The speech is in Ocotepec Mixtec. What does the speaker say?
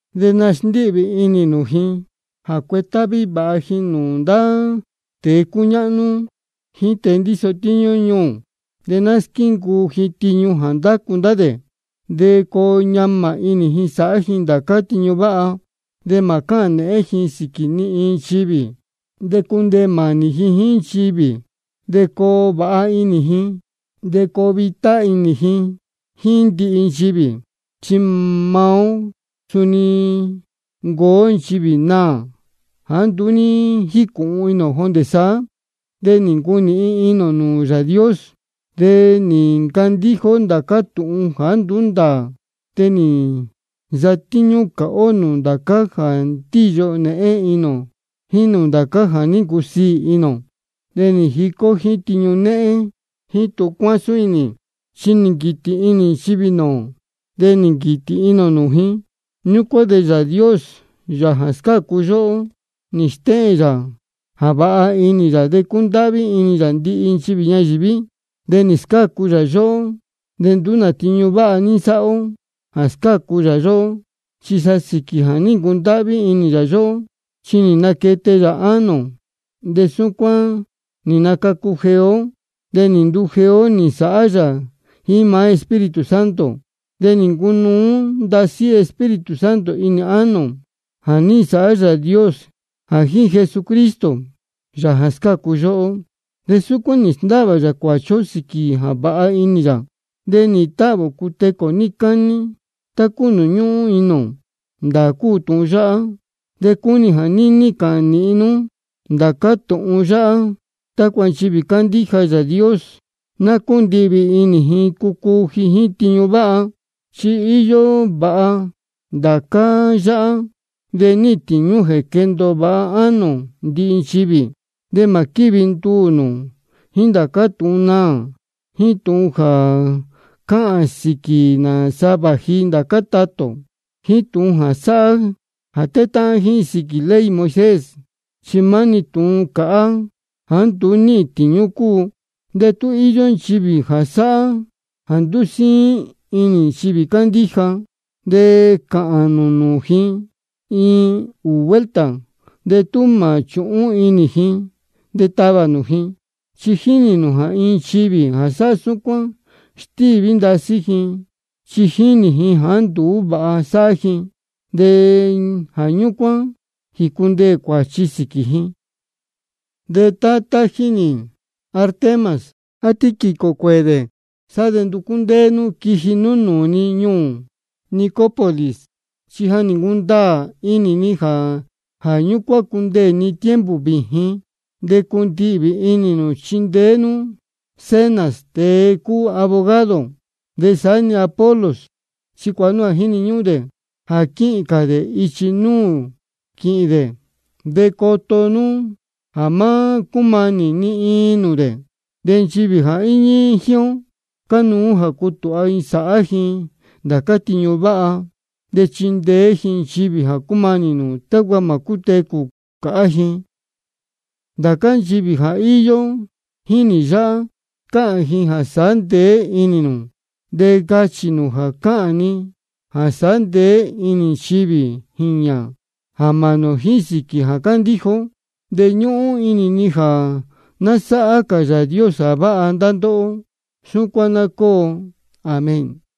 De nasndíhvī inī nū ji jā cuetáhví vāha ji nūū ndá tēe cúñáhnú jíín tēe ndíso tíñú ñuū. De ná squíncuu ji tiñu jā ndácu ndá dē, de coo ñamā inī ji sāhá ji ndācá tiñu váha. De mā cáhān nēhén ji sīquī ni iin nchivī, de cundeē mānī ji jíín nchivī, de coo vāha inī ji, de coo vitá inī ji jíín ndihi nchivī. Chi maá ó suni nī ncuu ó nchivī naā jāá nduú ní jícūhun inī ō jondē saá, de nī ncunīhin inī ō nūū Yāā Dios. De nī ncandíja ó ndācá tūhun jāá nduú ndāā, de nī nsatíñú cāhá ó nūū ndācá jā ní ndīyo nēhén inī ō jíín nūū ndācá jā ní ncusiī inī ō. De nī jica ó jíín tiñu néhén jíín tūhun cúcuásún inī. Chi nī nquītī inī nchivī nūū ō, de nī nquītī inī ō nūū ji. Ñúcuán de Yāā Dios, Yāā jā scácu yóhó, nī stéhēn yā jā vāha inī yā de cúndáhví inī yā ndihi nchivī ñayīví. De nī scácu yā yóhó, de nduú nā tiñu váha ní nsáhá ó jā scácu yā yóhó, chi sa sīquī jā ní ncundáhví inī yā yóhó. Chi nī naquete yā ánō ō, de súcuán nī nacacu jeé ó, de nī ndujeé ó nī nsāhá yā jíín maá Espíritu Santo. De nī ncunuú ndasí Espíritu Santo inī ánō ō, jā ní nsāhá Yāā Dios jā jíín Jesucristo, Yāā jā scácu yóhó. De súcuán nī sndáhvā yā cuāchi ó sīquī jā vāha inī yā, de nīhīn táhvī ō cutecū ō níí cání, tá cúu nūū ñúhún inī ō. Ndāā cúu tūhun yáhá, de cúnī ni jā níní cāhān nīhin nú ndācá tūhun yáhá, tácua nchivī cándíja Yāā Dios, ná cúndihvī inī ji cucuu ji jíín tiñu váha. Chi íyó vāha ndācá yáhá, de níhīn tīñú jā quéndōo vāha ánō ndihi nchivī. De mā quívi nduū nū jíín ndācá tūhun naā, jíín tūhun jā cáhān sīquī nāsa vāji ndācá tatā ō, jíín tūhun jā sáhá jā tétáhán ji sīquī ley Moisés. Chi maá-ni tūhun cāhá jāá nduú níhīn tīñú cúu. De tú íyó nchivī jā sáhá jā ndúsíín inī nchivī cándíja, de cāhān nū nūū ji iin ūū vuelta, de tú mā chūhún inī ji, de tavā nū ji. Chi jínī nū jā iin nchivī jā sáhá súcuán, stíví ndasí ji chi jínī ji jāá nduú vāha sáhá ji, de jā ñúcuán jícundeē cuāchi sīquī ji. De tá tají nī Artemas á Tíquico cuēē dē, sá de nducú ndéé nú quiji nú nūū ni ñuū Nicópolis, chi ja nī ncundaā inī ni jā ñúcuán cundeē ni tiempo vījin. De cundihvī inī nū chindeé nú Zenas, tēe cúu abogado, de saá-ni Apolos. Chi cuāha nú jā jíni ñúhún dē jā quíhīn cā dē ichi nūū quíhīn dē. De coto nú jā má cúmanī ni iin nūū dē. De nchivī jā íñí jíín ó, cánuú jā cutūha ji sāhá ji ndācá tiñu váha, de chindeé ji nchivī jā cúmanī nūū, tácua mā cútecū cāhá ji. Ndācá nchivī jā íyó jíín nī yáhá, cáhān ji jā sāhá ndeé inī nū. De cachī nū jā cáhān ni jā sāhá ndeé inī nchivī jīñā jā mānī ō jíín sīquī jā cándíja ó. De ñúhún inī ni jā ná sáhá cā Yāā Dios jā váha ndá ndóhó. Súcuán ná cóo. Amén.